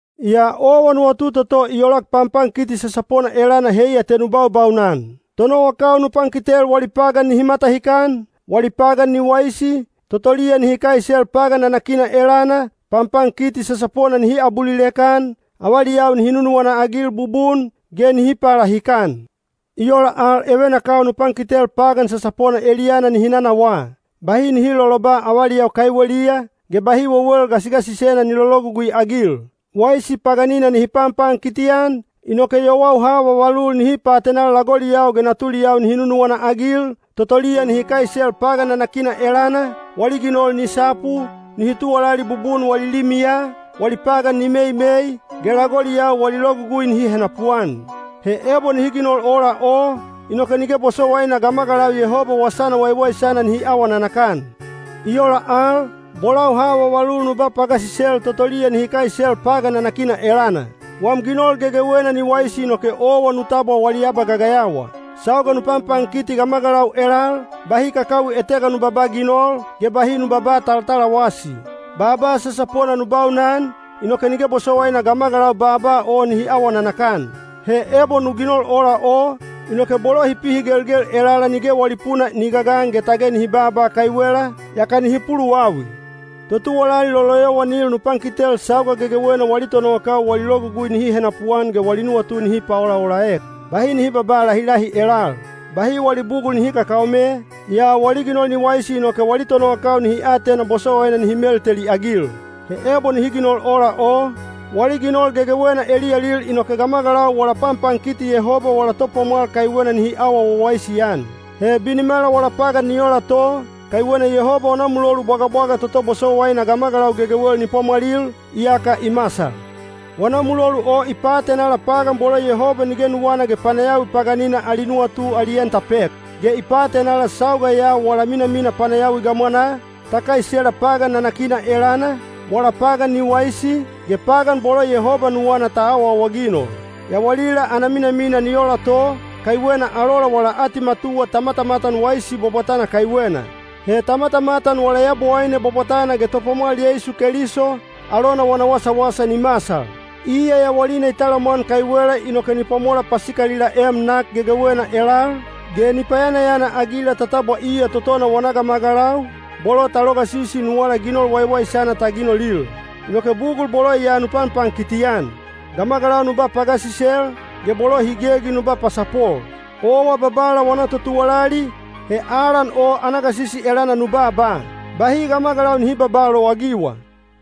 Yaa owa nuwatu toto i olak panpankiti sasapona elana heiya te nu baubaunan. Tonowakau nu pankitel wali pagan nihi matahikan, wali pagan ni waisi, totoliya nihi kaisel pagan nanakina elana, panpankiti sasapona nihi abulilek-an, avaliyau nihi nunuwana-agil bubun, ge nihi palahikan. I ola al evenakau nu pankitel pagan sasapona eliyana nihi nanawaa. Bahi nihi loloba avaliyau kaiweliya, ge bahi wewel gasigasisena ni lologugui-agil. Waisi paganina nihi panpankiti-an, inoke yowau ha vavalul nihi paatenal lagoliyau ge natuliyau nihi nunuwana-agil, totoliya nihi kaisel pagan nanakina elana, wali ginol ni sapu, nihi tuwalali bubun wali limiya, wali pagan ni meimei, ge lagoliyau wali logugui nihi henapuan. He ebo nihi ginol ola o, inoke nige bosowaina gamagalau Yehoba wasana waiwaisana nihi awa nanakan. I ola al, bolau ha vavalul nu ba pagasisel totoliya nihi kaisel pagan nanakina elana. Wam ginol gegewena ni waisi inoke owa nu tabwa wali abagagayawa. Sauga nu panpankiti gamagalau elal, bahi kakawi etega nu babaa ginol, ge bahi nu babaa talatalawasi. Baaba sasapona nu baunan, inoke nige bosowaina gamagalau baaba o nihi awa nanakan. He ebo nu ginol ola o, inoke bolo hi pihigelgel elala nige wali puna ni gagan ge tage nihi baaba kaiwela, yaka nihi puluwawi. Totuwalali loloyowanil nu pankitel sauga gegewena wali tonowakau wali logugui nihi henapuan ge wali nuwatu nihi paolaolaek. Bahi nihi babaa lahilahi elal. Bahi wali bugul nihi kakaome, yaa wali ginol ni waisi inoke wali tonowakau nihi atena bosowaina nihi melteliagil. He ebo nihi ginol ola o, wali ginol gegewena eliyalil inoke gamagalau wala panpankiti Yehoba wala Topwamwal kaiwena nihi awa wawaisi-an. He binimala wala pagan ni ola to, kaiwena Yehoba wana mulolu bwagabwaga toto bosowaina gamagalau gegewel ni pwamwalil, iyaka i masal. Wana mulolu o i paatenala pagan bolo Yehoba nige nuwana ge panayawi paganina ali nuwatu ali en ta pek. Ge i paatenala sauga ya wala minamina panayawi gamwanaa, ta kaisela pagan nanakina elana, wala pagan ni waisi, ge pagan bolo Yehoba nuwana ta awaawaginol. Yawalila ana minamina ni ola to, kaiwena alola wala atimatuwa ta matamatan waisi bwabwatana kaiwena. He ta matamatan wala Yabowaine bwabwatana ge Topwamwal Yeisu Keliso, alona wana wasawasa ni masal. Iya yawalina i talamwan kaiwela inoke ni pwamola pasikalilaem nak gegewena elal, ge ni payanayana-agila ta tabwa iya totona wana gamagalau, bolo ta logasisi nuwala ginol waiwaisana ta ginolil. Inoke bugul bolo ya nu panpankiti-an. Gamagalau nu ba pagasisel, ge bolo hi gegi nu ba pasapol. Owa Babala wana totuwalali, he alan o ana gasisi elana nu baaba. Bahi gamagalau nihi babaa lowagiwa.